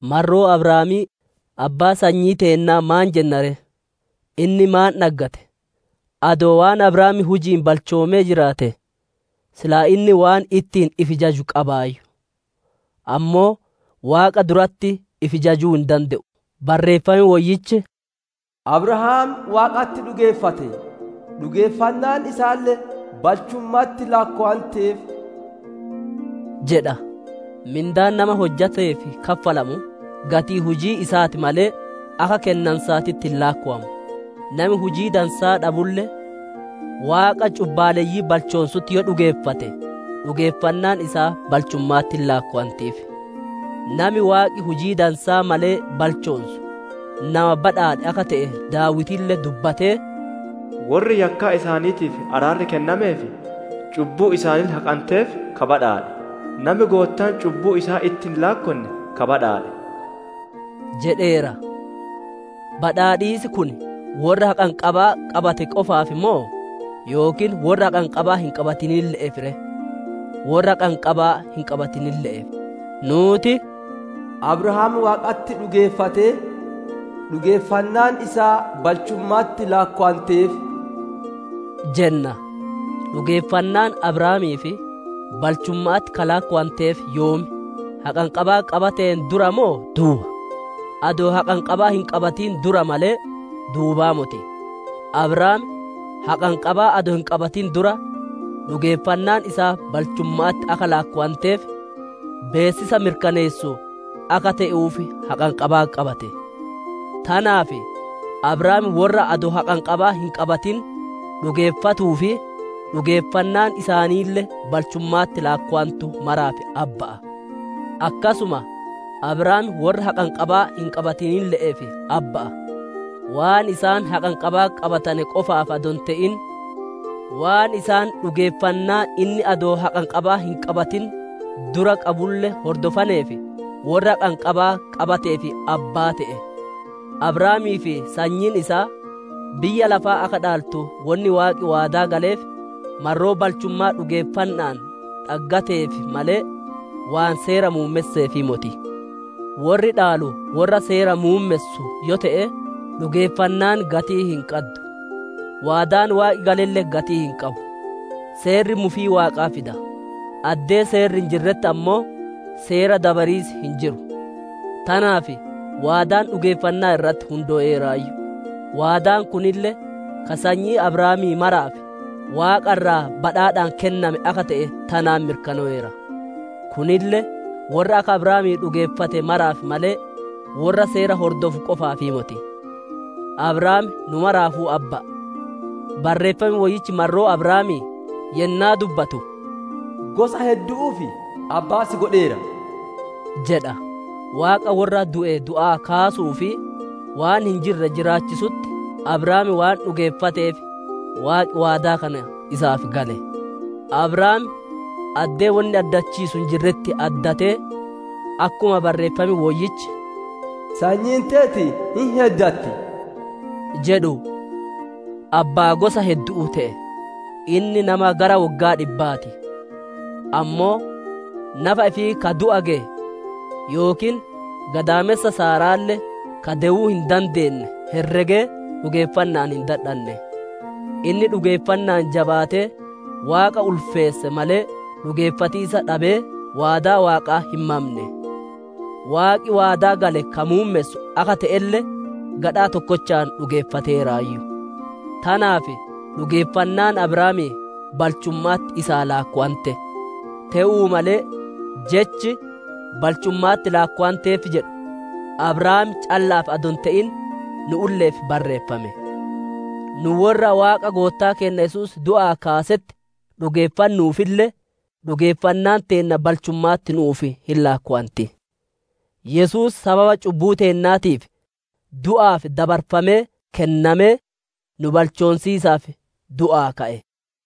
Marroo Abrahaamii, abbaa sanyii teennaa maan jenna ree? Inni maan dhaggate? Adoo waan Abrahaam huji'iin balchoomee jiraate, silaa inni waan ittiin ifi jaju qabaayyu; ammoo Waaqa duratti ifi jajuu hin dande'u. Barreeffam Woyyichi, «Abrahaam Waaqatti dhugeeffate, dhugeeffannaan isaalle balchumma'atti laakkowanteef» jedha. Mindaan nama hojjateef kaffalamu, gatii hujii isaa ti malee, akka kennansaatitti hin laakkowamu. Nami hujii dansaa dhabulle, Waaqa cubbaalleyyii balchoonsutti yoo dhugeeffate, dhugeeffannaan isaa balchumma'atti hin laakkowantiif. Nami Waaqi hujii dansaa malee balchoonsu, nama badhaadhe akka te'e Daawitille dubbatee, «Worri yakkaa isaaniitiif araarri kennamee fi cubbuun isaaniille haqanteef ka badhaadhe! Nami Goottaan cubbuu isaa itti hin laakkonne ka badhaadhe» jedheera. Badhaadhiisi kun worra haqanqabaa qabate qofaaf moo, yookiin worra haqanqabaa hin qabatinille'eef ree? Worra haqanqabaa hin qabatinille'eef. Nuuti, «Abrahaam Waaqatti dhugeeffatee, dhugeeffannaan isaa balchumma'atti laakkowanteef» jenna. Dhugeeffannaan Abrahaamiif, balchumma'atti ka laakkowanteef yoom? Haqanqabaa qabateen dura moo duuba? Adoo haqanqabaa hin qabatin dura malee, duubaa moti. Abrahaam haqanqabaa adoo hin qabatin dura, dhugeeffannaan isaa balchumma'atti akka laakkowanteef, beessisa mirkaneessu akka te'uuf haqanqabaa qabate; tanaaf Abrahaam worra adoo haqanqabaa hin qabatin dhugeeffatuu fi dhugeeffannaan isaaniille balchumma'atti laakkowantu maraaf abba'a. Akkasuma Abrahaam worra haqanqabaa hin qabatinille'eef abba'a; waan isaan haqanqabaa qabatane qofaaf adoo hin te'in, waan isaan dhugeeffannaa inni adoo haqanqabaa hin qabatin dura qabulle hordofaneef, worra haqanqabaa qabateef abbaa te'e. Abrahaamii fi sanyiin isaa biyya lafaa akka dhaaltu wonni Waaqi waadaa galeef, marroo balchummaa dhugeeffanna'aan dhaggateetiif malee, waan Seera muummesseefii moti. Worri dhaalu worra Seera muummessu yoo te'e, dhugeeffannaan gatii hin qaddu; waadaan Waaqi galelle gatii hin qabu. Seerri mufii Waaqaa fida; addee Seerri hin jirretti ammoo, Seera dabariis hin jiru. Tanaaf waadaan dhugeeffannaa irratti hundooyeeraayyu; waadaan kunille, ka sanyii Abrahaamii maraaf, Waaqa irraa badhaadhaan kenname akka te'e tanaan mirkanoweera. Kunille, worra akka Abrahaamii dhugeeffate maraaf malee, worra Seera hordofu qofaafii moti; Abrahaam nu maraafuu abba'a. Barreeffam Woyyichi marroo Abrahaamii yennaa dubbatu, «Gosa heddu'uuf abbaa si godheera» jedha; Waaqa worra du'e du'aa kaasuu fi waan hin jirre jiraachisutti Abrahaam waan dhugeeffateef, Waaqi waadaa kana isaaf gale. Abrahaam addee wonni addachiisu hin jirretti addatee, akkuma Barreeffam Woyyichi, «Sanyiin teeti hin heddatti» jedhu, abbaa gosa heddu'uu te'e. Inni nama gara woggaa dhibbaa ti; ammoo nafa ifii ka du'a geye, yookiin gadaamessa Saara'aalle ka dewuu hin dandeenne herregee dhugeeffanna'aan hin dadhanne. Inni dhugeeffanna'aan jabaatee Waaqa ulfeesse malee, dhugeeffatiisa dhabee, waadaa Waaqaa hin mamne. Waaqi waadaa gale ka muummessu akka te'elle gadhaa tokkochaan dhugeeffateeraayyu. Tanaaf dhugeeffannaan Abrahaamii balchumma'atti isaa laakkowante. Te'uu malee jechi, «Balchumma'atti laakkowameef» jedhu, Abrahaam calla'aaf adoo hin te'in, nu'ulle'eef barreeffame. Nu worra Waaqa Goottaa keenna Yesuus du'aa kaasetti dhugeeffannuufille, dhugeeffannaan teenna balchumma'atti nu'uuf hin laakkowanti. Yesuus sababa cubbuu teennaatiif du'aaf dabarfamee kennamee, nu balchoonsiisaaf du'aa ka'e.